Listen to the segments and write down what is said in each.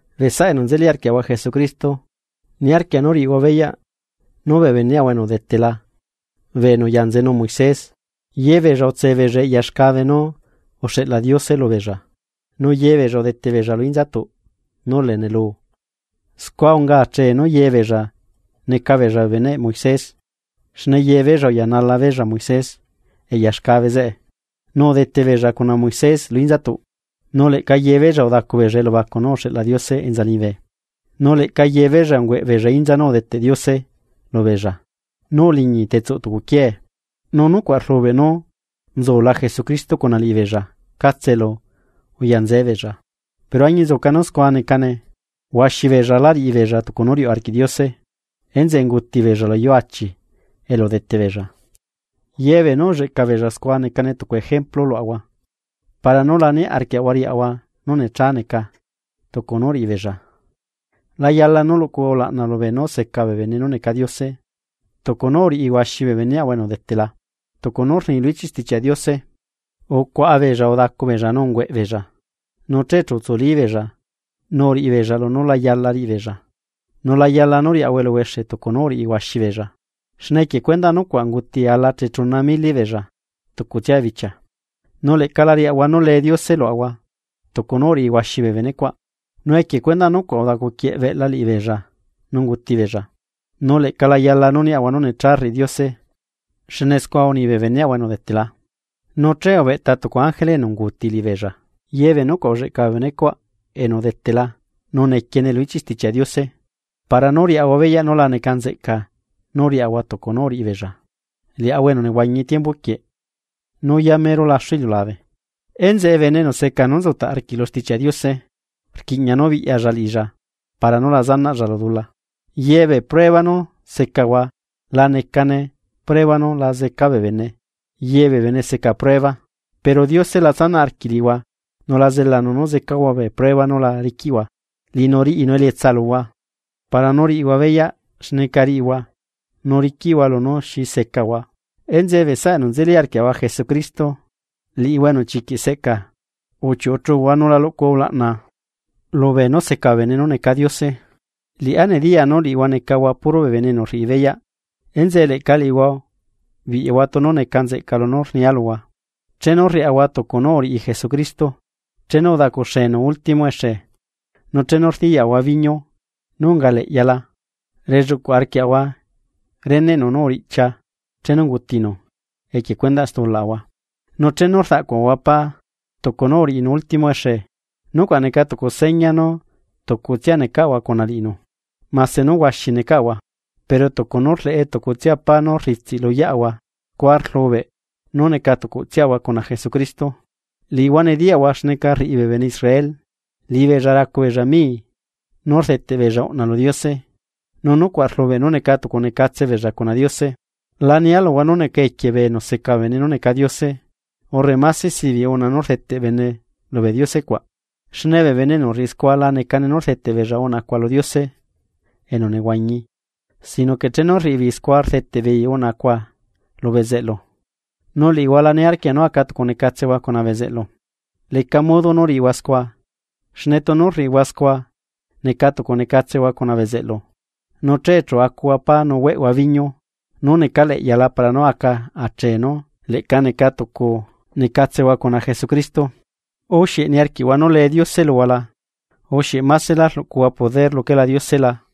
Bee saꞌa enu nzeli arquiaꞌahua Jesucristo, niarquia nú riꞌihua beyaꞌ nú bee beneꞌahua enu udetela bee enu uya nzenu Moisés, yebeella utse beella eꞌya xcabe nú uxeꞌla Diose lubeella, nu yebeella udete beella lu inzatuꞌ nú lee nelu. Scua unga achee nú yebeella neca beella bee beneꞌ Moisés xne yebeella uyanala beella Moisés eꞌya xcabe zeꞌe, nu udete beella cuna Moisés lu inzatuꞌ. Nu leꞌca yebeella udacu beella elubacu nú uxeꞌla Diose enza liñibe. Nu leꞌca yebeella ungüeꞌ beella inza nú udeteꞌ Diose lubeella nú uliñi tetsuꞌ tucu quiee. Nu nucuaꞌ rlubeꞌ nú nzula Jesucristo cuna liꞌibeella catse elu uyanzee beella. Pero añinzuca nú scua necane, huaxi beella lá riꞌibeella tucu nú riuꞌ arquiꞌ Diose, enzeꞌe unguti beella luyuu achi elu udete beella. Yebee nú ulleꞌca beella scua necane tucu ejemplu luaꞌahua, para nú la niarquiaꞌahua riaꞌahua nú necha neca tucu nú uriꞌi beella. La yala nú luꞌcuhua ulaꞌna lubeenú seca bee bene nú neca Diose tucu nú uriꞌi huaxi bee beneꞌahua enu udetela, tucu nú rni lu ichiꞌ Stichiaꞌ Diose: “Ucuaꞌa beella udacu beella nu ungüeꞌ beella, nu che chu utsuli beella nu uriꞌibeella lunú la yala riꞌi beella.” Nu la yala nú riaꞌahua eluhuexe tucu nú uriꞌi huaxi beella. Xne equie cuendaꞌ nucuaꞌ unguti ala chechuna mili beella tucutsia bichia. Nu leꞌca la riaꞌahua nú lee Diose luaꞌahua tucu nú uriꞌi huaxi bee benecuaꞌ, nu equie cuendaꞌ nucuaꞌ udacuquieꞌ beꞌla liꞌibeella nu unguti beella. Nu leꞌca la yala nú niaꞌahua nú necha rriꞌi Diose, xne scua uni bee beneꞌahua enu udetela, nu che ubeꞌta tucu ángele enu unguuti liꞌibeella. Ye bee nucuaꞌ ulleꞌca bee benecuaꞌ enu udetela nu nequiene lu ichiꞌ Stichiaꞌ Diose para nú riaꞌahua beyaꞌ nú la neca nzeꞌca nú riaꞌahua tucu nú uriꞌi beella, liaꞌahua enu nehuañi tiembu quieꞌ nú yamero laxu iliulabe. Enzeꞌe bene enu seca nú nzutaꞌ arquiꞌ lu Stichiaꞌ Diose, rquiꞌña nú biꞌyalla liꞌilla para nú la riꞌilla dula. Ye bee prueba nú secahua la necane prueba nú la zeca bee bene yebee bene seca prueba. Pero Diose la tsanaꞌ arquiꞌ liꞌihua nu la zelanu nú zecahua bee prueba nú la riquiꞌhua. Liꞌinu riꞌinu elietsa luhua, para nú riꞌihua beyaꞌ xneca riꞌihua nú riquiꞌhua lunú xi secahua. Enzeꞌe bee saꞌa enu nzeli arquiaꞌahua Jesucristo, liꞌihua enu chiquiꞌ seꞌcaa uchiuꞌu chuhua nu la luꞌcuhua ulaꞌna lubee nú seca bee bene nú neca Diose. Liꞌá nediyaa nú liꞌihua necahua puro bee bene enu rriꞌi beyaꞌ, enzeꞌe leꞌca liꞌihua biꞌyahua tunu neca nzeꞌca lunú rnia luhua. Chenu rriaꞌahua tucu nú uriꞌi Jesucristo, chenu udacuxenu último exe, nu chenu rdiyaꞌahua viño nú unga leꞌyala relluꞌcuꞌ arquiaꞌahua reneꞌnu nú uriꞌchia chenu ungutinu equie cuendaꞌ stulaꞌahua. Nu chenu rdaꞌcuaꞌahua pá tucu nú uriꞌinu ultimo exe, nucuaꞌ neca tucu seña nú tucutsia necaꞌahua cuna liꞌinu. Mase nú huaxi necaꞌahua, pero tucu nú rleꞌe tucutsia pá nú rritsiꞌ luyeꞌahua scua rlubeꞌ nú neca tucutsiaꞌahua cuna Jesucristo. Liꞌihua nediyaꞌhua xneca rriꞌi bee bene Israel liꞌibeella racubeella mii nú rdeteꞌ beella uꞌna lu Diose nu nucuaꞌ rlubeꞌ nú neca tucunecatse beella cuna Diose. La nia luhua nú neca equie bee enu seca bee bene nú neca diose, urre máse sibiꞌ uꞌna nú rdeteꞌ bene lubee diose cuaꞌ. Xne bee bene enu rriꞌi scua la necane nú rdeteꞌ beella uꞌnacua lu Diose enu nehuañi sino que chenu rriꞌi beei scua rdeteꞌ beei uꞌna cuaꞌ lu bezeꞌlu, nu liꞌihua la niarquia nú aca tucu necatsehua cuna bezeꞌlu. Leca modo nú riꞌihua scua, xne tunu rriꞌihua scua neca tucu necatsehua cuna bezeꞌlu, nu che chu acuhua pá nu hueꞌhua viño nú necaleꞌyala, para nú aca achee nú leꞌca neca tucu necatselahua cuna Jesucristo. ¿U xieꞌ niarquiꞌhua nú lee Diose luhua la? ¿U xieꞌ másela rluꞌcuaꞌahua poder luquela Diose la?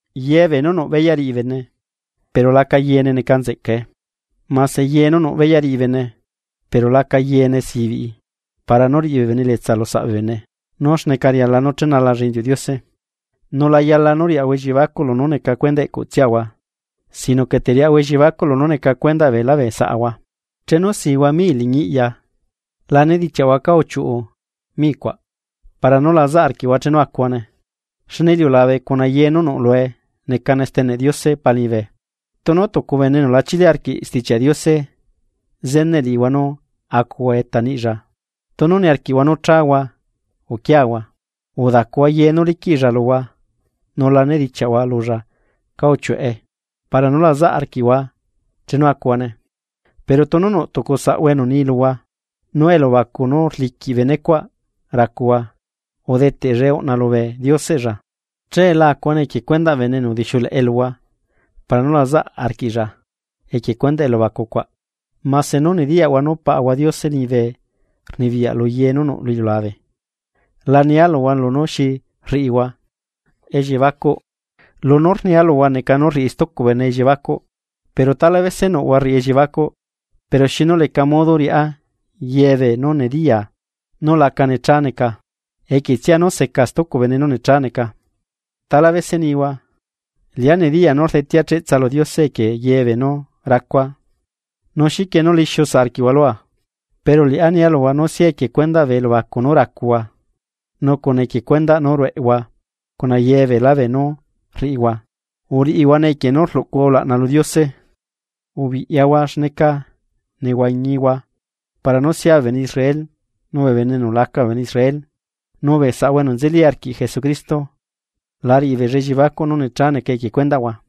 Yee bee nú nuꞌ beyaꞌ riꞌi bene, pero laca yeene neca nzeꞌcae. Mase ye nú nuꞌ beyaꞌ riꞌi bene, pero laca yeene sibiꞌi para nú riꞌi bee bene elietsa lusaꞌ bee bene nú xneca riala nú chenalalla inziuꞌ Diose. Nu la yala nú riaꞌahua elliebacuꞌ lunú neca cuendaꞌ eꞌcuꞌtsiaꞌahua sino que teriaꞌahua elliebacuꞌ lunú neca cuendaꞌ beelá bee saꞌahua. Chenu sihua mii liñi iꞌya, la nedichiaꞌhua cá uchiuꞌu micuaꞌ, para nú lazaꞌ arquiꞌhua chenu acuhuane. Xne iliulabe cuna ye nú nuꞌ lue neca steneꞌ Diose Pa liñibe. Tunu tucu bene enu lachili arquiꞌ Stichiaꞌ Diose zeneꞌ liꞌihua nú acuhua eta niꞌlla, tunu niarquiꞌhua nú chahua uquiahua. Udacuhua ye nú liquiꞌlla luhua nu la nedichiaꞌhua lulla cá uchiuꞌe para nú la zaꞌ arquiꞌhua chenu acuhuane. Pero tunu nuꞌ tucu saꞌhua enu ni luhua nú elubacu nú rliquiꞌ benecuaꞌ racuhua udeteꞌllae uꞌna lubee dioseꞌlla, che la acuhuane equie cuendaꞌ bene enu udixiuleꞌe luhua para nú la zaꞌa arquiꞌlla equie cuendaꞌ elubacu cuaꞌ, mase nú nediyaꞌhua nú Paꞌahua Diose liñibe rnibiyaꞌ luye nú nuꞌ lu iliulabe. La nia luhua lunú xi rriꞌihua elliebacuꞌ, lunú rnia luhua neca nú rriꞌi stucu bene elliebacuꞌ. Pero tala bese nuꞌhua rriꞌi elliebacuꞌ: “¿Pero xinu leca modo riꞌá yebee nú nediyaa nú laca necha neca equietsia nú seca stucu bene nú necha necane?” Tala bese nihua: “Liꞌá nediyaa nú rdetea cheꞌtsa lu Diose equie yebee nú racua, ¿nu xiquie nú lixiu saꞌ arquiꞌhua lua?” Pero liꞌá nia luhua nú sia equie cuendaꞌ bee elubacu nú racuhua, nu cuna equie cuendaꞌ nú rueꞌhua cuna ye beelá beenú rriꞌihua, uriꞌihuane equie nú rluꞌcuhua ulaꞌna lu Diose. Ubiꞌyahua xneca nehuañihua para nú sia bee bene Israel nu bee bene enu laca bee bene Israel, nu bee saꞌahua enu nzeli arquiꞌ Jesucristo la riꞌibeella elliebacuꞌ nú necha neca equie cuendaꞌhua.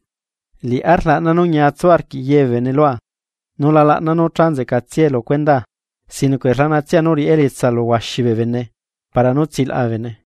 Liꞌá rlaꞌna nú ñiatsu arquiꞌ ye bee bene lua. Nu la laꞌnaa nú cha nzeꞌcatsiae lu cuendaa, sino que rlaꞌnatsia nú riꞌá elietsa lu huaxi bee bene para nú tsilaꞌa bee bene.